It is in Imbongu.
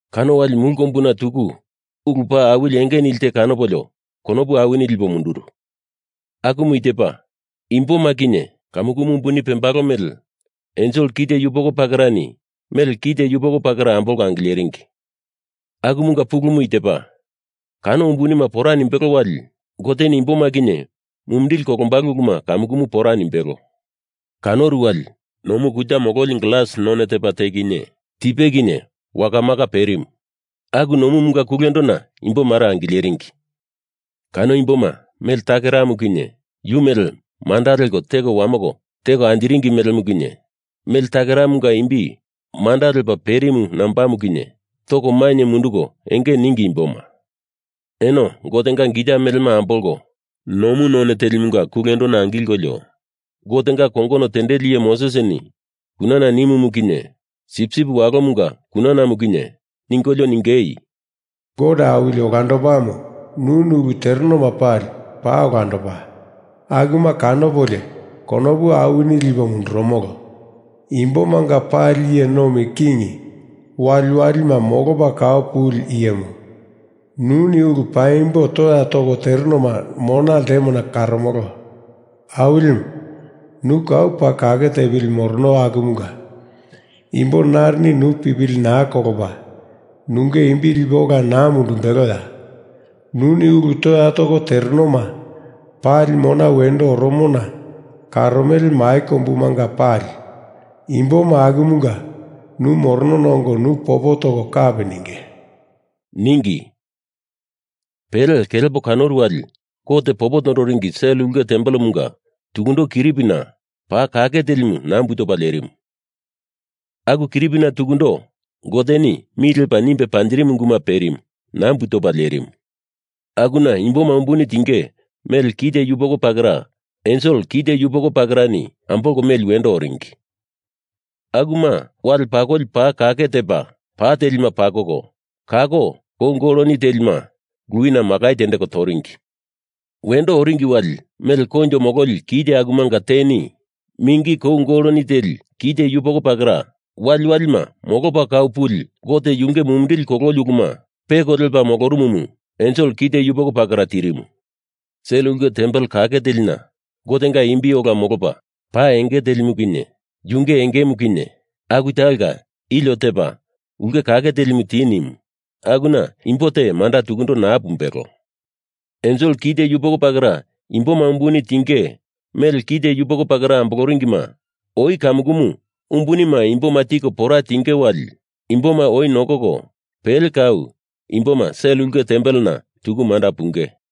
Kano wali mulu kombuna tuku ulu paa awili enge nili te kanopolio konopu awini lipo munduru. Akumu i tepa: Imboma kinye kamukumu umbuni pembalo mele ensel kite yupoko pakerani mele kite yupoko pakera ambolko angileringi. Akumunga pulumu i tepa: Kano umbunima pora nimbelo wali Goteni imboma kinye mumindili kolombalo uluma kamukumu pora nimbelo. Kanoru wali nomu kuta mololi glas none tepa te kinye tipe kinye wakamaka perimu. Aku nomumunga kulendona imbo mare angileringi. Kano imboma mele takeramu kinye, yu mele manda leko teko wamoko teko anjiringi melemu kinye, mele takeramunga imbi manda lepa perimu nambamu kinye, toko mainye munduko enge ningi imboma. Eno Gotenga gita melema ambolko nomu none telimunga kulendona angilkolio, Gotenga kongono tendeli iye Mosesini kunana nimumu kinye Sipsip Walomunga kunanamu kinye ningolio ningei, “Gote Awili Olandopamu nuni ulu terenoma pali paa olandopa, akuma kanopolio konopu awini lipo mundurumolo. Imbomanga Pali Iye Nomi King Waliwalima Molopa Kau Puli Iyemu, nuni ulu paimbo toya toko terenoma mona ltemona karomolo. Awilimu, nu kau paa kake tepili morono akumunga imbo narini nu pipili naa kolopa, nunge imbi lipe ola naa mundumbeloya? Nuni ulu toya toko terenoma pali mona wendo oromona karomele mai kombumanga pali imboma akumunga nu moronona ongo nu popo toko kapi ninge,” ningi. Pele kelepo kanoru wali Gote popo toringi sel ulke tempelena tukundo kiripina paa kake telimu nambu topa lerimu. Aku kiripina tukundo Goteni mi lepa nimbe panjirimu unguma perimu, nambu topa lerimu. Akuna imboma umbuni tinge mele kite yupoko pakera ensel kite yupoko pakerani ambolko meli wendo oringi. Akuma wale pakoli paa kake tepa pa telima pakoko, kako kou goloni telima luwina makai tendeko toringi. Wendo oringi wali mele koinjo mololi kite akumanga teni mingi kou goloni teli kite yupoko pakera, waliwalima molopa kau puli Gote yunge mumindili kololi uluma peko lepa molorumumu ensel kite yupoko pakera tirimu. Sel ulke tempel kake telina Gotenga imbi ola molopa pa enge telimu kinye yunge engemu kinye aku talonga ilio tepa ulke kake telimu ti nimu, akuna imbo te manda tukundo naa pumbelo. Ensel kite yupoko pakera imboma umbuni tinge mele kite yupoko pakera amboloringima oi kamukumu umbunima imboma tiko pora tiengei wali imboma oi nokoko pele kau imboma sel ulke tempelena tuku manda punge.